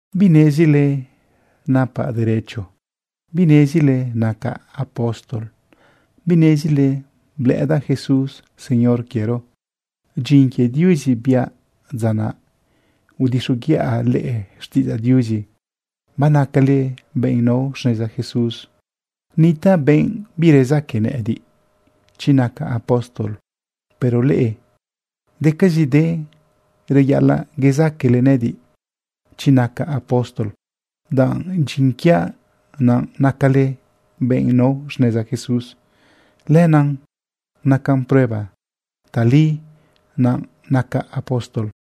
¿Binezile napaꞌ derecho? ¿Binezile nacaꞌ apóstol? ¿Binezile blëꞌëdaꞌ Jesús Señor quiero? Dyin quie Diuzi biaꞌ dza naꞌ udixoguiꞌa leꞌe xtiꞌidzaꞌ Diuzi banacale benꞌ nao xneza Jesús. Nitaꞌ benꞌ birezaque nëꞌëdiꞌ chi nacaꞌ apóstol. Pero leꞌe, decazide reyaꞌalaꞌ yezaquele nëꞌëdiꞌ chi nacaꞌ apóstol, danꞌ dyin quiaꞌ naꞌ nacale benꞌ nao xneza Jesús. Lenaꞌ nacan prueba tali naꞌ nacaꞌ apóstol.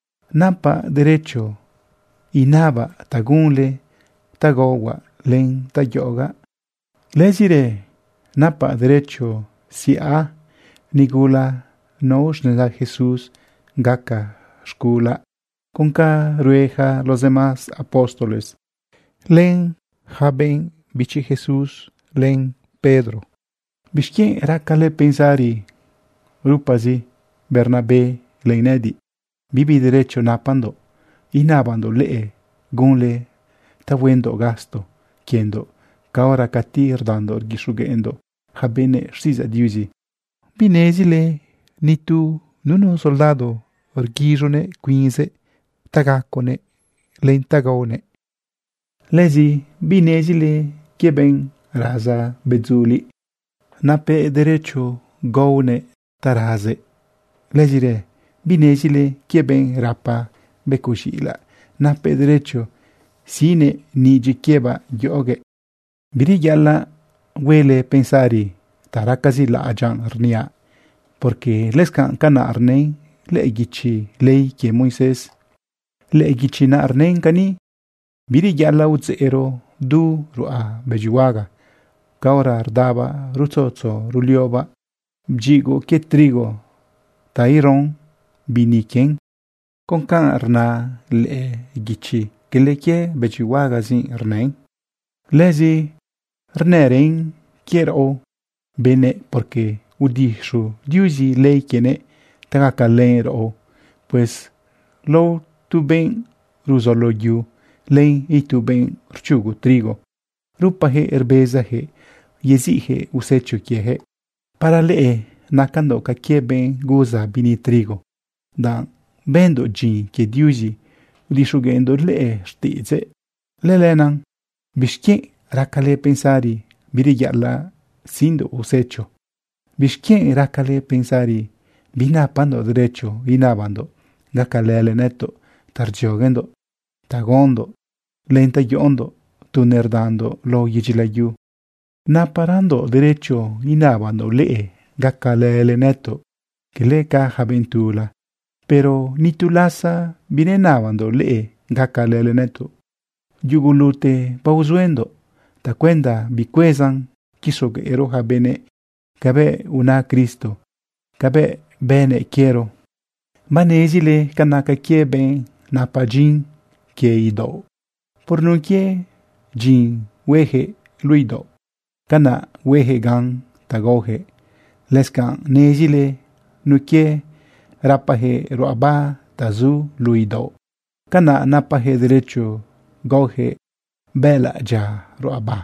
Napaꞌ derecho inabaꞌ ta gunle ta gaohuaꞌ len ta yoꞌogaꞌ. Lëzirë napaꞌ derecho siꞌa nigula nao xneza Jesús gaca z̃gulaꞌ con ca rue yaca los demás apóstoles, lenlë yaca benꞌ bichi Jesús, len Pedro. ¿Bixquienꞌ racale pensari rupazi Bernabé len nëꞌëdiꞌ, bibi derecho napandoꞌ inabandoꞌ leꞌe gunle ta huendoꞌ gasto quiendoꞌ caora cati rdandoꞌ rguixogueꞌndoꞌ yaca benëꞌ xtiꞌidzaꞌ Diuzi? ¿Binezile ganu nunu soldado rguiz̃uguëꞌ cuinzëꞌ ta gaconëꞌ len ta gaonëꞌ? ¿Lëzi binezile quie benꞌ raza bedzuliꞌ? Napëꞌ derecho gaohuëꞌ ta razëꞌ. ¿Lëzirë binezile quie benꞌ rapa becoꞌ z̃iꞌilaꞌ? Napëꞌ derecho siꞌnëꞌ nidyiꞌ quiebaꞌ yoꞌoguëꞌ. Bireyaꞌalaꞌ huele pensari ta racazi laꞌadyaꞌ rniaꞌ, porque lëscanꞌ canaꞌ rnën lëꞌë guichi ley quie Moisés. Lëꞌë guichi naꞌ rnën cani: “Bireyaꞌalaꞌ udzeꞌro du ruꞌa bëdyihuaga caora rdabaꞌ rutzutzu ruliobaꞌ bdyigoꞌ quie trigo ta ero bini quien.” Con ca rna lëꞌë guichi, cala quie bëdyihuagazi rnën. Lëzi rnërën quie raꞌo benëꞌ, porque udixu Diuzi ley quienëꞌ ta gacalën raꞌo. Pues lao tu benꞌ ruzolo yu, len itu benꞌ rchugo trigo, rupayaquëꞌ rbezayaquëꞌ yeziꞌyaquëꞌ usecho quieyaquëꞌ. Para leꞌe nacandoꞌ ca quie benꞌ guza bini trigo, danꞌ bëndoꞌ dyin quie Diuzi udixogueꞌndoꞌ leꞌe xtiꞌidzëꞌ. Lëlenaꞌ ¿bixquienꞌ raquele pensari bireyaꞌalaꞌ siꞌndoꞌ usecho? ¿Bixquienꞌ raquele pensari binapandoꞌ derecho inabandoꞌ gacalële nëtoꞌ ta rdzioguendoꞌ ta gaondoꞌ len ta yoꞌondoꞌ tu nerdandoꞌ lao yedyi layu? Naparandoꞌ derecho inabandoꞌ leꞌe gacalële nëtoꞌ cala ca yaca benꞌ tula. Pero ni tu lasa binenabandoꞌ leꞌe gacalële nëtoꞌ. Yugulute baozuendoꞌ tacuenda bicuezan quixogueꞌro yaca benëꞌ cabëꞌ una Cristo, cabëꞌ bënëꞌ quiero. Banezile ca naca quie benꞌ napa dyin quie idaoꞌ. Por nun quie dyin hueyaquëꞌ luꞌu idaoꞌ, canaꞌ hueyaquëꞌ gan ta gaoyaquëꞌ. Lëscanꞌ nezile nun quie rapayaquëꞌ ruꞌaba ta zu luꞌu idaoꞌ, canaꞌ napayaquëꞌ derecho gaoyaquëꞌ bëꞌëlaꞌ dyia ruꞌaba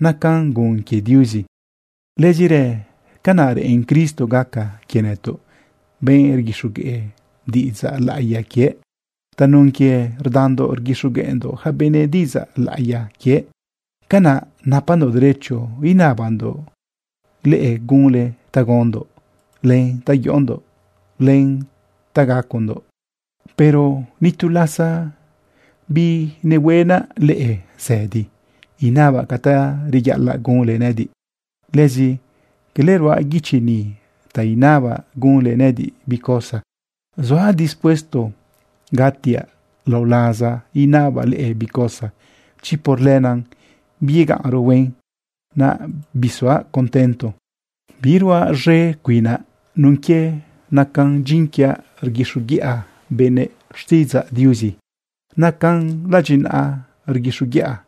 nacan gun quie Diuzi. Lëzirë canaꞌ reꞌen Cristo gaca quie nëtoꞌ, benꞌ rguixogueꞌ diꞌidzaꞌ laꞌiya quiëꞌ. Tanun quie rdandoꞌ rguixogueꞌndoꞌ yaca benëꞌ diꞌidzaꞌ laꞌiya quiëꞌ, canaꞌ napandoꞌ derecho inabandoꞌ leꞌe gunle ta gaondoꞌ, len ta yoꞌondoꞌ, len ta gacondoꞌ. Pero ni tu lasa binehuenaꞌ leꞌe zëdi inabaꞌ ca ta reyaꞌalaꞌ gunle nëꞌëdiꞌ. Lëzi cala ruaꞌ guichi ni ta inabaꞌ gunle nëꞌëdiꞌ bi cosa. Zuaꞌ dispuesto gatiaꞌ lao laza inabaꞌ leꞌe bi cosa, chi por lenaꞌ biyegaꞌnro huen, naꞌ bisuaꞌ contento. Biruaꞌ z̃e cuinaꞌ nun quie nacan dyin quiaꞌ rguixoguiꞌa benëꞌ xtiꞌidzaꞌ Diuzi. Nacan ladyinaꞌa rguixoguiꞌaꞌ.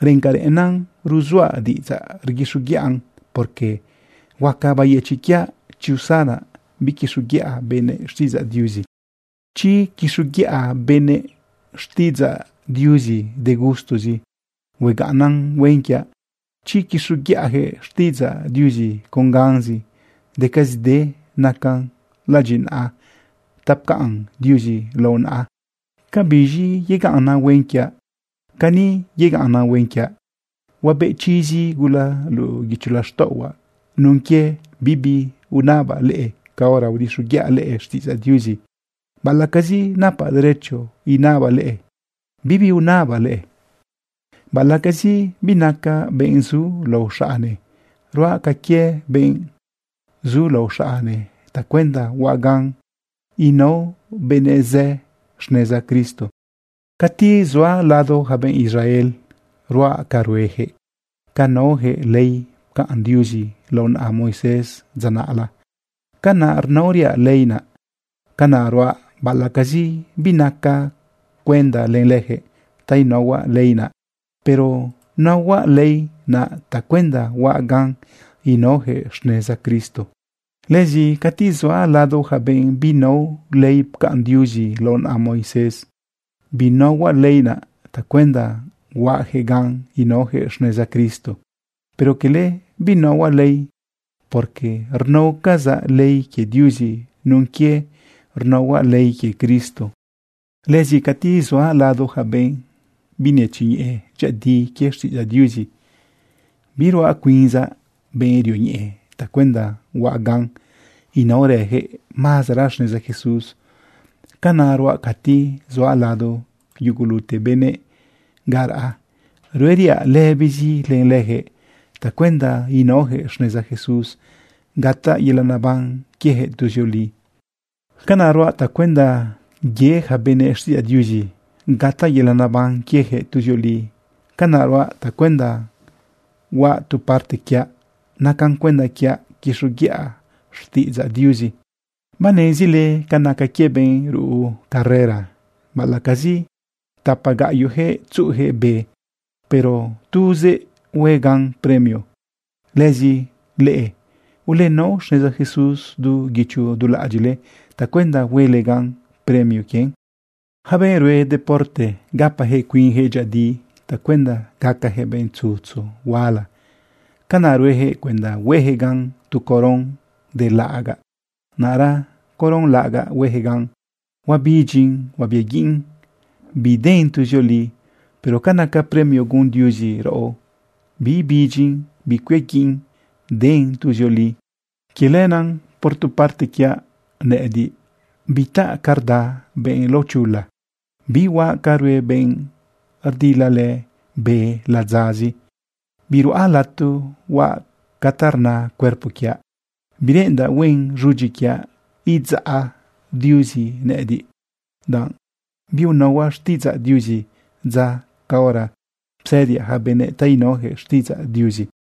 Reꞌen ca reꞌenna ruzuaꞌ diꞌidzaꞌ rguixoguiꞌan, porque huaca bayëchiꞌ quiaꞌ chi usanaꞌ biquixoguiꞌa benëꞌ xtiꞌidzaꞌ Diuzi. Chi quixoguiꞌa benëꞌ xtiꞌidzaꞌ Diuzi de gustozi, huegaꞌnnan huen quiaꞌ. Chi quixoguiꞌayaquëꞌ xtiꞌidzaꞌ Diuzi con ganzi, decazide nacan ladyinaꞌa ta pcaꞌn Diuzi lao naꞌa. ¿Cabiz̃i yegaꞌnnan huen quiaꞌ? Cani yegaꞌnnan huen quiaꞌ: Huabeꞌ chizi gula luꞌu guicho laxtaꞌohuaꞌ nun quie bibi unabaꞌ leꞌe caora udixoguiꞌa leꞌe xtiꞌidzaꞌ Diuzi. Baꞌalaꞌcazi napaꞌ derecho inabaꞌ leꞌe, bibi unabaꞌ leꞌe. Baꞌalaꞌcazi binacaꞌ benꞌ zulao xaꞌne, ruaꞌ ca quie benꞌ zulao xaꞌne tacuenda huaꞌ gan inao benëꞌ zë xneza Cristo. Cati zuaꞌ lado yaca benꞌ Israel, ruaꞌ ca rueyaquëꞌ. Ca naoyaquëꞌ ley pcaꞌn Diuzi lao naꞌa Moisés dza naꞌla, canaꞌ rnaoriaꞌ ley naꞌ. Canaꞌ ruaꞌ baꞌalaꞌcazi binacaꞌ cuenda len leyaquëꞌ ta inaohuaꞌ ley naꞌ, pero naohuaꞌ ley naꞌ tacuenda huaꞌ gan inaoyaquëꞌ xneza Cristo. Lëzi cati zuaꞌ lado yaca benꞌ binao ley pcaꞌn Diuzi lao naꞌa Moisés, binaohuaꞌ ley naꞌ tacuenda huaꞌyaquëꞌ gan inaoyaquëꞌ xneza Cristo. Pero cala binaohuaꞌ ley, porque rnaocazaꞌ ley quie Diuzi nun quie rnaohuaꞌ ley quie Cristo. Lëzi cati zuaꞌ lado yaca benꞌ binetzioñeꞌe dyëꞌëdi quie xtiꞌidzaꞌ Diuzi, biruaꞌ cuinzaꞌ benꞌ rioñeꞌe tacuenda huaꞌ ganꞌ inaorayaquëꞌ mazera xneza Jesús. Canaꞌ ruaꞌ cati zuaꞌ lado yugulute benëꞌ ga raꞌa, rueriaꞌ lëbizi len leyaquëꞌ tacuenda inaoyaquëꞌ xneza Jesús gataꞌ yelaꞌ neban quiejëꞌ tuzioli. Canaꞌ ruaꞌ tacuenda ye yaca benëꞌ xtiꞌidzaꞌ Diuzi gataꞌ yelaꞌ neban quieyaquëꞌ tuzioli. Canaꞌ ruaꞌ tacuenda huaꞌ tu parte quiaꞌ nacan cuenda quiaꞌ quixoguiꞌa xtiꞌidzaꞌ Diuzi. Banezile ca naca quie benꞌ ruꞌu carrera. Baꞌalaꞌcazi tapa gaꞌyoꞌyaquëꞌ tzuꞌuyaquëꞌ be, pero tuzëꞌ hue gan premio. Lëzi leꞌe, ulenao xneza Jesús du guicho du laꞌadyiꞌle tacuenda huele gan premio quien. Yaca benꞌ rue deporte gapayaquëꞌ cuinyaquëꞌ dyëꞌëdi tacuenda gacayaquëꞌ benꞌ tzutzu huala. Canaꞌ rueyaquëꞌ cuenda hueyaquëꞌ gan tu coron de laꞌagaꞌ. Naꞌra coron laꞌagaꞌ hueyaquëꞌ gan, huabidyin huabiaguiꞌn, biden tuzioli. Pero ca naca premio gun Diuzi raꞌo, biibidyin bicuiaguiꞌn, den tuzioli. Quie lenaꞌ, por tu parte quiaꞌ nëꞌëdiꞌ, bitaꞌ ca rda benꞌ laochula, bihuaꞌ ca rue benꞌ rdilalë be ladzazi. Biruꞌa lato huaꞌ ca ta rna cuerpo quiaꞌ. Bireꞌendaꞌ huen z̃udyi quiaꞌ idzaꞌ Diuzi nëꞌëdiꞌ, danꞌ biunaohuaꞌ xtiꞌidzaꞌ Diuzi dza caora psëdiaꞌ yaca benëꞌ ta inaoyaquëꞌ xtiꞌidzaꞌ Diuzi.